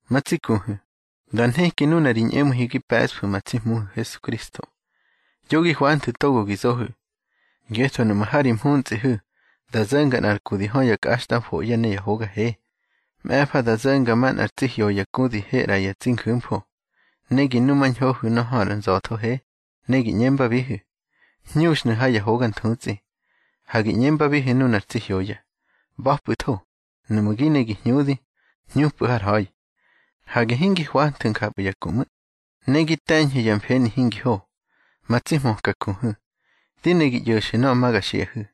Ma tsi kuhu̱, dá nheki nuna ri ñꞌemu̱ihu̱ gi pe̱ꞌsfu̱ ma tsi Hmuhu̱ Hesukristo, yo gi hwanthu̱ togo gi zohu̱. Ngetho nuꞌmu̱ ha ri mhuntsꞌihu̱ da zo̱nga nꞌar ku di hö ya kꞌaxtꞌamfoꞌye̱ ne ya hoga he, ꞌme̱fa da zo̱nga manꞌar tsi hyoya ku di he ꞌra ya tsi nju̱mfo, ne gi numañhohu̱ nuna hö ar nza̱tho he, ne gi ꞌñembabihu̱: Hñuxnu̱ ha ya hoga nthutsꞌi. Ha gi ꞌñembabihu̱ nunar tsi hyoya: ꞌBa̱pꞌu̱tho. Nuꞌmu̱ gi ne gi hñudi, hñupꞌu̱ har ha̱i. Hage hingi hwanthu̱ njapꞌu̱ ya ku ꞌmu̱, ne gi te̱ñhu̱ ya mfeni hingi ho. Ma tsi hmöka kuhu̱, di ne gi ꞌyo̱xu̱ nöꞌö ma ga xiꞌahu̱: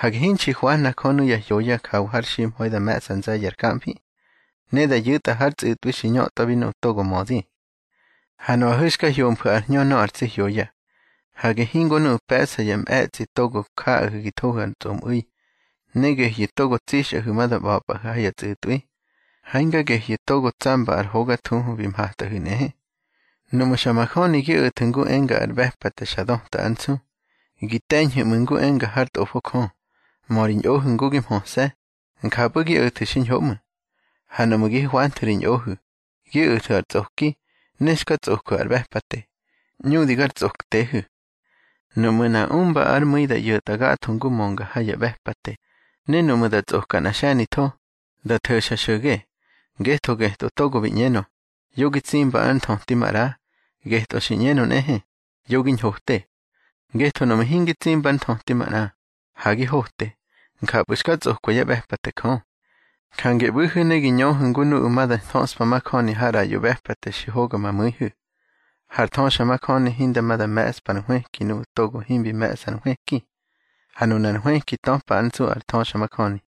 Hage hinxi hwahna Jö nuya hyoya jawa har ximha̱i da me̱ꞌsa nze̱ye̱ ar jamfi, ne da yu̱tꞌa hár tsꞌu̱tꞌwi xi ñötꞌwabi nuꞌu̱ togo mödi. Ha nuꞌahu̱ xka hyomfu̱ ar hñö nöꞌö ar tsi hyoya. Hage hingo nuꞌu̱ pe̱ꞌsa yá mꞌe̱tsꞌi togo jaꞌahu̱ gi thohu̱ ar tsꞌomꞌu̱i, ne gehyu̱ togo tsixꞌahu̱ ma da ꞌba̱pꞌahu̱ ha ya tsꞌu̱tꞌwi. Ha hinga gehyu̱ togo tsamba ar hoga thuhu bi mhatꞌahu̱ nꞌehe. Nuꞌmu̱ xa majöni gi o̱thu̱ ngu enga ar ꞌbe̱pate xa döta ár nsu, gi te̱ñhu̱ ꞌmu̱ ngu enga hár Tꞌofo Jö: Mö ri ñꞌohu̱ ngu gi mhöse̱. Njapꞌu̱ gi o̱thu̱ xiñho ꞌmu̱. Ha nuꞌmu̱ gi hwanthu̱ ri ñꞌohu̱, gi o̱thu̱ ar tsꞌoki, ne xka tsꞌojwu̱ ar ꞌbe̱pate, ꞌñudi gar tsꞌoktehu̱. Nuꞌmu̱ nꞌa umba ár mu̱i da ꞌyo̱tꞌa gatho ngu mönga ha ya ꞌbe̱pate, ne nuꞌmu̱ da tsꞌoka nꞌa xe̱nitho, da tho̱xa xo̱ge. Ngetho getꞌö togo bi ꞌñenö: Yo gi tsimba ár nthöti maꞌra, getꞌö xi ꞌñenö nꞌehe: Yo gi ñhote. Ngetho nuꞌmu̱ hingi tsimba ár nthöti manꞌa, ha gi hote, njapꞌu̱ xka tsꞌokwa yá ꞌbe̱pate Jö. Jange ꞌbu̱hu̱ ne gi ñöhu̱ ngu nuꞌu̱ ma da thöꞌspa majöni har ꞌraꞌyo ꞌbe̱pate xi hoga ma mu̱ihu̱. Har thöxamajöni hinda ma da mꞌe̱ꞌspa ar nhwëki nuꞌu̱ togo himbi me̱ꞌsa ar nhwëki. Ha nunar nhwëki töpa ár nsu ar thöxamajöni.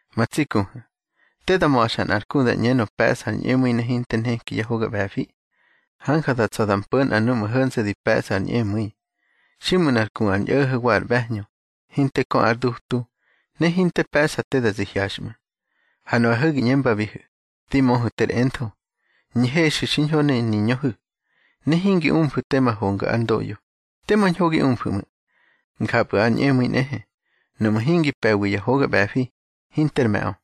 Ma tsi kuhu̱, te da ma̱xa nꞌar ku da ꞌñenö pe̱ꞌsa ar ñꞌemu̱i ne hinte nheki yá hoga ꞌbe̱fi. Hanja da tsa̱ da mpo̱ nꞌa nuꞌmu̱ ho̱nse̱ di mpe̱ꞌsa ar ñꞌemu̱i. Xiꞌmu̱ nꞌar ku ar ñꞌo̱ho̱ wa ar ꞌbe̱hñö, hinte kö ár dutu, ne hinte pe̱ꞌsa te da zi hyaxꞌmu̱, ha nuꞌahu̱ gi ꞌñembabihu̱: Di möhu̱ ter entho, ñhexu̱ xiñho ne niñöhu̱, ne hingi umfu̱ tema honga ár ndoꞌyo, tema ñho gi umfu̱ ꞌmu̱. Njapꞌu̱ ar ñꞌemu̱i nꞌehe, nuꞌmu̱ hingi pe̱wi ya hoga ꞌbe̱fi, hinter me̱ꞌö.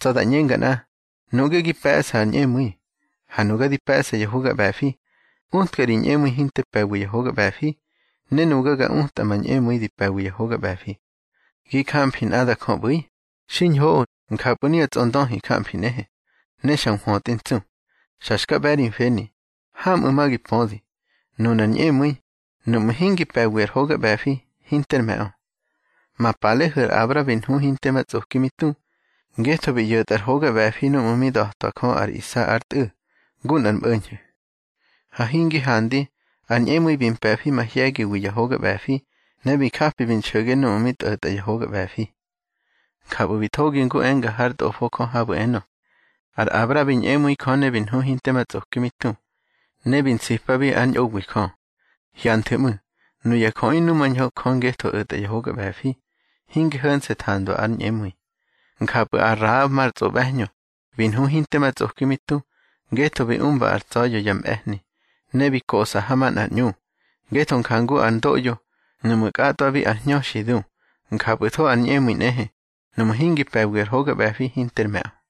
Tsa̱ da ꞌñenga nꞌa: Nuꞌge gi pe̱ꞌsa ar ñꞌemu̱i, ha nuga di pe̱ꞌsa ya hoga ꞌbe̱fi. Utka ri ñꞌemu̱i hinte pe̱wi ya hoga ꞌbe̱fi, ne nuga ga utꞌa ma ñꞌemu̱i di pe̱wi ya hoga ꞌbe̱fi. Gi jamfi nꞌada Jö ꞌbu̱i. Xiñhoꞌö. Njapꞌu̱ nuya tsꞌondöhi jamfi nꞌehe, ne xa nhwötꞌi ntsu. Xa xka ꞌbe̱ ri mfeni. Hamꞌu̱ ma gi pödi, nunar ñꞌemu̱i, nuꞌmu̱ hingi pe̱wi ar hoga ꞌbe̱fi, hinter me̱ꞌö. Ma palehu̱ ar Abra bi nhu hinte ma tsꞌoki mi tu, ngetho bi ꞌyo̱tꞌa ar hoga ꞌbe̱fi núꞌmu̱ mi da̱twa Jö ar Isa ár tꞌu̱, ngu nꞌar mꞌo̱ñho̱. Ha hingi handi, ar ñꞌemu̱i bi mpe̱fi mahye̱giwi ya hoga ꞌbe̱fi, ne bi japi bi nxo̱ge núꞌmu̱ mi tꞌo̱tꞌa ya hoga ꞌbe̱fi. Njapꞌu̱ bi thogi ngu enga hár Tꞌofo Jö habu̱ enö: Ar Abra bi ñꞌemu̱i Jö ne bi nhu hinte ma tsꞌoki mi tu, ne bi nsipabi ár ñꞌowi Jö. Hyanthu̱ ꞌmu̱, nuya jöꞌi numañho Jö ngetho o̱tꞌa ya hoga ꞌbe̱fi, hinge ho̱nse̱ thandwa ár ñꞌemu̱i. Njapꞌu̱ ar Rahab mar tsꞌoꞌbe̱hñö, bi nhu hinte ma tsꞌoki mi tu, ngetho bi umba ar tsa̱ya̱ yá mꞌe̱hni, ne bi koꞌsa ha manꞌar ꞌñu. Ngetho jangu ar ndoꞌyo, nuꞌmu̱ kꞌatꞌwabi ar hñö xi du, njapꞌu̱tho ar ñꞌemu̱i nꞌehe, nuꞌmu̱ hingi pe̱wi ya hoga ꞌbe̱fi hinter me̱ꞌö.